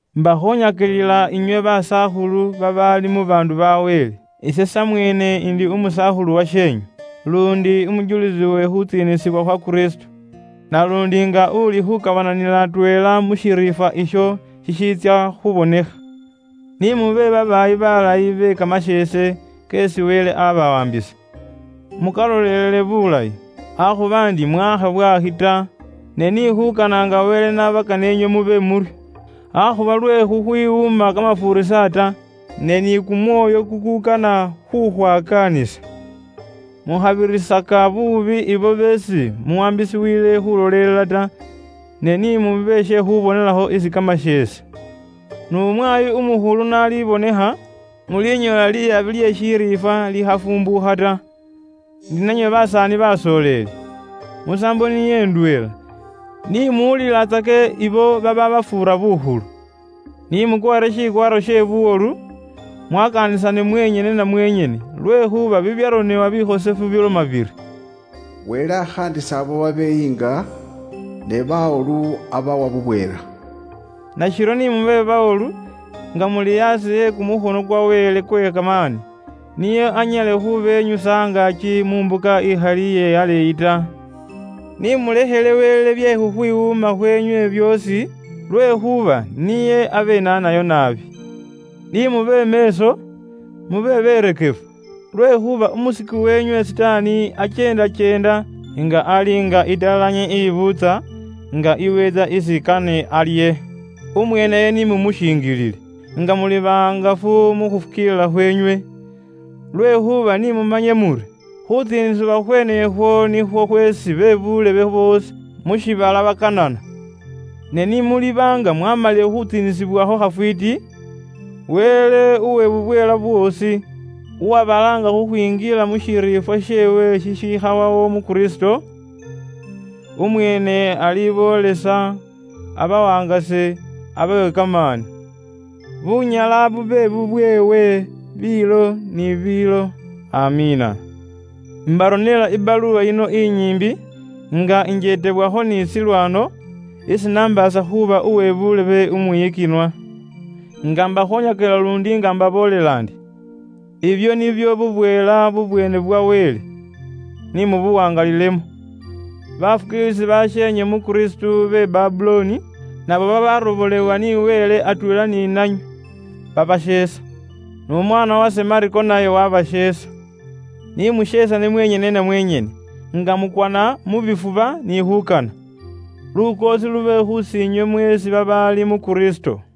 Imbakhoonyakilila inywe basakhulu babaali mu baandu ba Wele, ise samweene umusaakhulu washeenywe, luundi umujulisi we khuutsiinisibwa khwa Kristo, naluundi nga uuli khuukabananila atweela mu shiriifwa isho shishiitsya khubonekha. Ni mube babaayi baalayi be kamasheese keesi Wele aabawaambisa. Mukaloleele bulayi, akhuba ndi mwaakha bwaakhi ta, ne ni khuukana nga Wele n'abakana ari inywe mube muryo. Akhuba lwe khukhwiwuuma kamafuurisa ta, ne ni kumwoyo kukuukana khukhwakaanisa. Mukhabirisaka buubi abo beesi muwaambisiwile khuulolelela ta. Ne ni mube she khuubonelakho isi kamasheese. N'umwaayi Umukhulu n'alibonekha, mulinyoola liyabi lye shiriifwa likhafumbuukha ta. Ni nanywe basaani basooleli, musaambo niyo ndweela, ni muwulilatsake abo babaabafuura bukhulu. Ni mukwaare shikwaaro she buwolu, mwakaanisane mwenyene na mwenyene, lwekhuuba bibyaronebwa bikhosefu biloma biri, “Wele akhaandisa ibo babeyiinga, ne bawolu abawa bubweela.” Nashiryo ni mube bawolu, nga muli aasi e kumukhono kwa Wele kwe kamaani, nio anyale khubenyusa angaaki mu mbuka ikhali iye aleeyi ta. Ni mulekhele Wele bye khukhwiwuuma khweenywe byoosi, lwekhuuba niye abenaanayo naabi. Ni mube meeso, mube beerekefu. Lwekhuuba umusiku weenywe Sitaani akyeendakyeenda, nga ali nga italanyi ibuutsa, nga iweentsa isi kane alye. Umweeneyo ni mumushinjilile, nga muli bahangafu mu khufukiilila khweenywe. Lwekhuuba ni mumanye muri, khuutsiinisibwa khweene ukhwo nikhwo khweesi be buulebe boosi mu shiibala bakaanana. Ne ni muliba nga mwaamalile khutsiinisibwakho khafwiiti, Wele uwe bubweela bwoosi, uwabalaanga khukhwinjila mu shiriifwa sheewe shikhawawo mu Kristo, umweene aliboolesa, abawangase, abawe kamaani. Bunyala bube bubweewe biilo ni biilo. AMIINA. Imbaronela ibaluwa yino inyiimbi nga injeetebwakho ni Silwano, isi nambaasa khuuba uwe buulebe umwiyikinwa, nga mbakhoonyakilila luundi nga imbaboolela ndi; ibwo nibwo bubweela bwa ŋali bwa Wele. Ni mubuwaangalilemo. Baafukiilisi basheenywe mu Kristo be Babulooni, nabo babaarobolewa ni Wele atweela ni nanywe, baabasheesa. N'umwaana wase Mako naye waabasheesa. Ni musheesane mwenyene na mwenyene, nga mukwana mu bifuba ni khuukana. Lukoosi lube khusiinywe mweesi babaali mu Kristo.